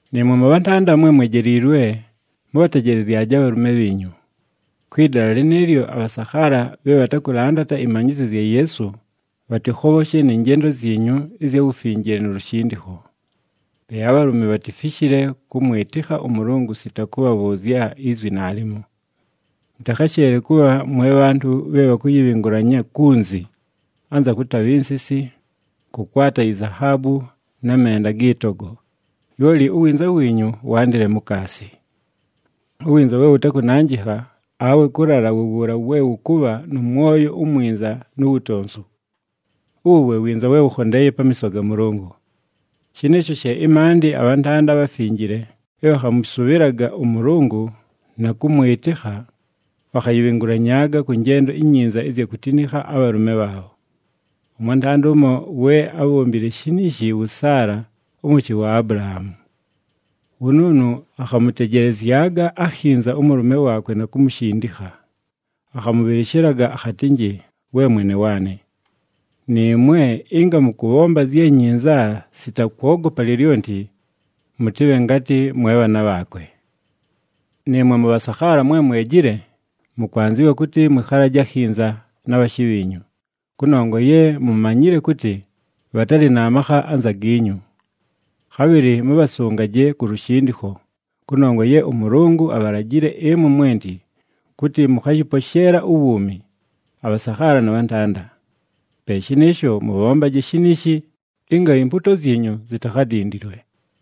Nɨɨmwe mʉbhantanda mwe mwejiilwe mʉbhatejelezyaje abhalʉme bhiinyu. Kwɨ dala lɨnɨɨlyo, abhasakhaala bhe bhatakʉlandata ɨmanyɨzyo zya Yeesu, bhatɨkhobhoshe nɨ njendo zyinyu ɨzya wufinjile nu lushindikho. Pe abhalʉme bhatifishile kʉmwɨtɨkha ʉMʉlʉngʉ sita kʉbhabhʉʉzya izwi naalimo. Mʉtakhasheele kʉbha mwe bhantʉ bhe bhakʉyɨbhɨngʉlanya kunzi, anza kʉtabha insisi, kʉkwata izahaabu na menda agɨ togo, lyoli uwinza wiinyu wandɨle mukaasi. Uwinza we wʉtakʉnanjɨkha awe kʉlala wu wuula we wʉkʉbha nʉ mwoyo umwinza nu wutonsu. Uwu we winza we wʉkhondeeye pamiiso ga Mʉlʉngʉ. Shɨnɨɨsho she ɨmaandɨ abhantanda abhafinjile bhe bhakhamʉsʉbhɨlaga ʉMʉlʉngʉ na kʉmwɨtɨkha, bhakhayɨbhɨngʉlanyaaga kʉ njendo inyinza ɨzya kutinikha abhalʉme bhaabho. Ʉmwantanda ʉmo we ábhombile shiniishi wʉ Saala ʉmʉshɨ wa Abulahaamu. Wʉnʉʉnʉ akhamʉtejelezyaga akhinza ʉmʉlʉme waakwe na kumushindikha, akhamʉbhɨlɨshɨlaga akhatɨnjɨ, “We mwene waanɨ.” Nɨɨmwe, ɨnga mʉkʉbhomba zye nyinza sita kwogopa lyolyonti, mʉtɨbhe ngatɨ mwe bhaana bhaakwe. Nɨɨmwe mʉbhasakhaala mwe mwejile, mʉkwanzɨwa kʉtɨ mwɨkhalaje akhinza na bhashɨ bhiinyu, kʉnongwa ye mumanyile kʉtɨ bhatalɨ na makha anza giinyu. Khabhɨlɨ mʉbhasʉngaje ku lushindikho, kʉnongwa ye ʉMʉlʉngʉ abhalajile ɨmwe mwenti kʉtɨ mʉkhayɨposheela uwuumi, abhasakhaala na bhantanda. Pe shɨnɨɨsho, mʉbhombaje shiniishi, ɨnga impuuto zyinyu zitakhadindilwe.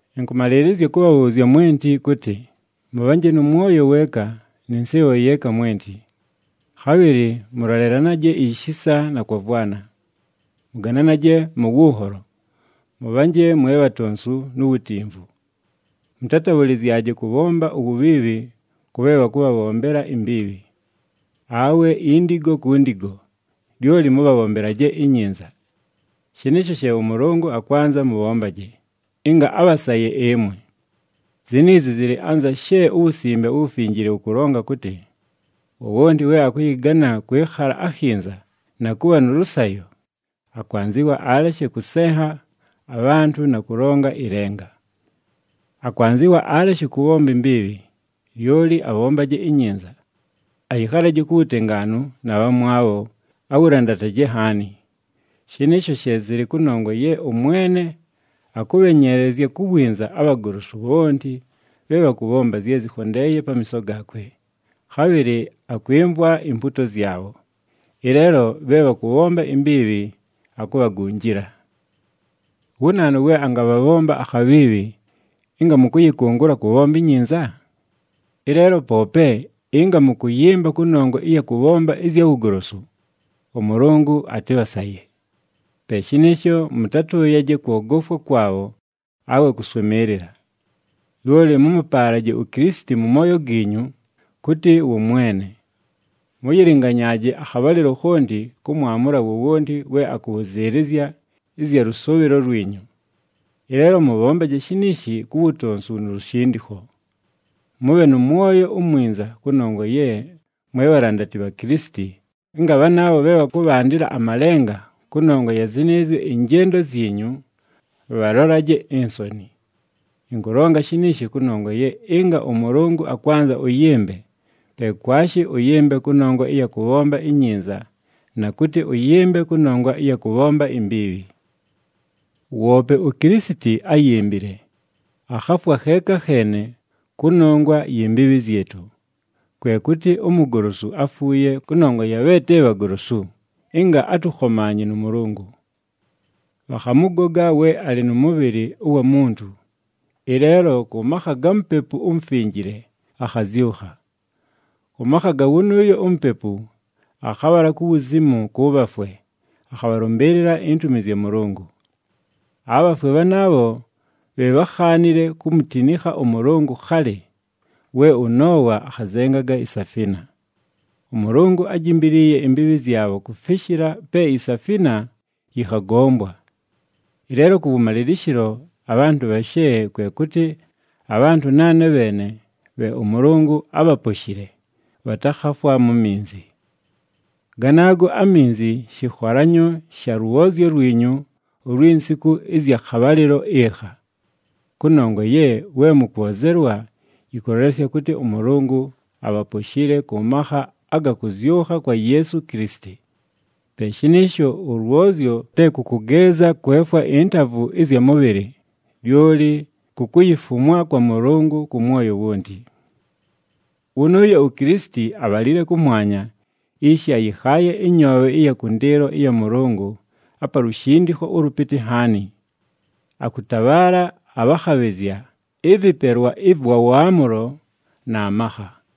Ɨnkʉmalɨɨlɨzya kʉbhabhʉʉzya mwenti kʉtɨ, mʉbhanje nʉ mwoyo weeka nɨ nsɨɨbho yeeka mwenti, khabhɨlɨ mʉlolelanaje ishisa na kwavwana. Mʉgananaje mʉ wʉnholo, mʉbhanje mwe bhatonsu nu wutimvu. Mʉtatabhʉlɨzyaje kʉbhomba uwubhiibhi kʉ bhe bhakʉbhabhombela imbiibhi, awe indigo ku ndigo, lyoli mʉbhabhombelaje inyinza. Shɨnɨɨsho she ʉMʉlʉngʉ akwanza mʉbhombaje, ɨnga abhasaye ɨmwe. Ziniizi zɨlɨ anza she uWusimbe uWufinjile wʉkʉlonga kʉtɨ, “Wowonti we akʉyɨgana kwɨkhala akhinza na kʉbha nʉ lʉsayo, akwanzɨwa aleshe kʉsenha abhantʉ na kʉlonga ɨlenga. Akwanzɨwa aleshe kʉbhomba imbiibhi, lyoli abhombaje inyinza. Ayɨkhalaje ku wutengaanu na bhamwabho, awulandataje nhaani. Shɨnɨɨsho she zɨlɨ kʉnongwa ye ʉMwene akʉbhenyeelezya ku winza abhagolosu bhonti bhe bhakʉbhomba zye zɨkhondeeye pamiiso gaakwe, khabhɨlɨ akwɨmvwa impuuto zyabho. Ɨleelo bhe bhakʉbhomba imbiibhi, akubhagunjila.” Wu naanu we angabhabhomba akhabhiibhi ɨnga mʉkʉyɨkʉngʉla kʉbhomba inyinza? Ɨleelo poope ɨnga mʉkʉyɨmba kʉnongwa ɨya kʉbhomba ɨzya wugolosu, ʉMʉlʉngʉ atɨbhasaye. Pe shɨnɨɨsho, mʉtatʉʉyaje kwogofwa kwabho awe kʉswɨmɨɨlɨla. Lyoli mʉmʉpaalaje uKilisiti mʉ mooyo giinyu kʉtɨ wʉ Mwene. Mʉyɨlɨnganyaaje akhabhalɨlo khonti kʉmwamʉla wowonti we akʉbhʉzɨɨlɨzya ɨzya lʉsʉʉbhɨlo lwinyu. Ɨleelo mʉbhombaje shiniishi ku wutonsu nu lushindikho. Mʉbhe nʉ mwoyo umwinza kʉnongwa ye mwe bhalandati bha Kilisiti, ɨnga bhanaabho bhe bhakʉbhandɨla amalenga kʉnongwa ya zɨnɨɨzyo ɨnjendo zyinyu, bhalolaje insoni. Ɨnkʉlonga shɨnɨɨsho kʉnongwa ye ɨnga ʉMʉlʉngʉ akwanza ʉyɨmbe, pe kwashi ʉyɨmbe kʉnongwa ɨya kʉbhomba inyinza na kʉtɨ ʉyɨmbe kʉnongwa ɨya kʉbhomba imbiibhi. Woope uKilisiti áyimbile, akhafwa kheeka kheene kʉnongwa yi mbiibhi zyɨtʉ, kwe kʉtɨ umugolosu áfuuye kʉnongwa ya bhe te bhagolosu, ɨnga atʉkhomaanye nʉ Mʉlʉngʉ. Bhakhamʉgoga we alɨ nʉ mʉbhɨlɨ ʉwa muntu, ɨleelo kʉ makha ga Mupepu uMufinjile akhazyʉkha. Kʉ makha ga wʉnʉʉyo uMupepu akhabhala ku wuzimu kʉ bhafwe akhabhalʉmbɨɨlɨla intumi zya Mʉlʉngʉ. Abhafwe bhanaabho bhe bhákhaanile kumutinikha ʉMʉlʉngʉ khalɨ, we ʉNoowa akhazenganga isafina. ɄMʉlʉngʉ ájimbiliiye imbiibhi zyabho kufishila pe isafina yɨkhagombwa. Ɨleelo kʉwʉmalɨlɨshɨlo abhantʉ bhashe, kwe kʉtɨ abhantʉ naane bheene bhe ʉMʉlʉngʉ ábhaposhile, bhatakhafwa mu minzi. Ganaago aminzi shɨkholanyo sha lwozyo lwinyu ulwi nsiku ɨzya khabhalɨlo ɨkha. Kʉnongwa ye we mʉkwozelwa yɨkʉlolesya kʉtɨ ʉMʉlʉngʉ abhaposhile kʉ makha aga kʉzyʉkha kwa Yeesu Kilisiti. Pe shɨnɨɨsho, ʉlwozyo te kʉ kʉgeeza kwefwa intavu ɨzya mʉbhɨlɨ, lyoli ku kuyifumwa kwa Mʉlʉngʉ kʉ mwoyo wonti. Wʉnʉʉyo uKilisiti abhalile kʉmwanya, ishi ayɨkhaaye ɨnyoobhe ɨya kʉndɨɨlo ɨya Mʉlʉngʉ, apa lushindikho ʉlʉpɨtɨ nhaani. Akʉtabhaala abhakhabhɨzya, ɨvɨpelwa ɨvwa waamʉlo na makha.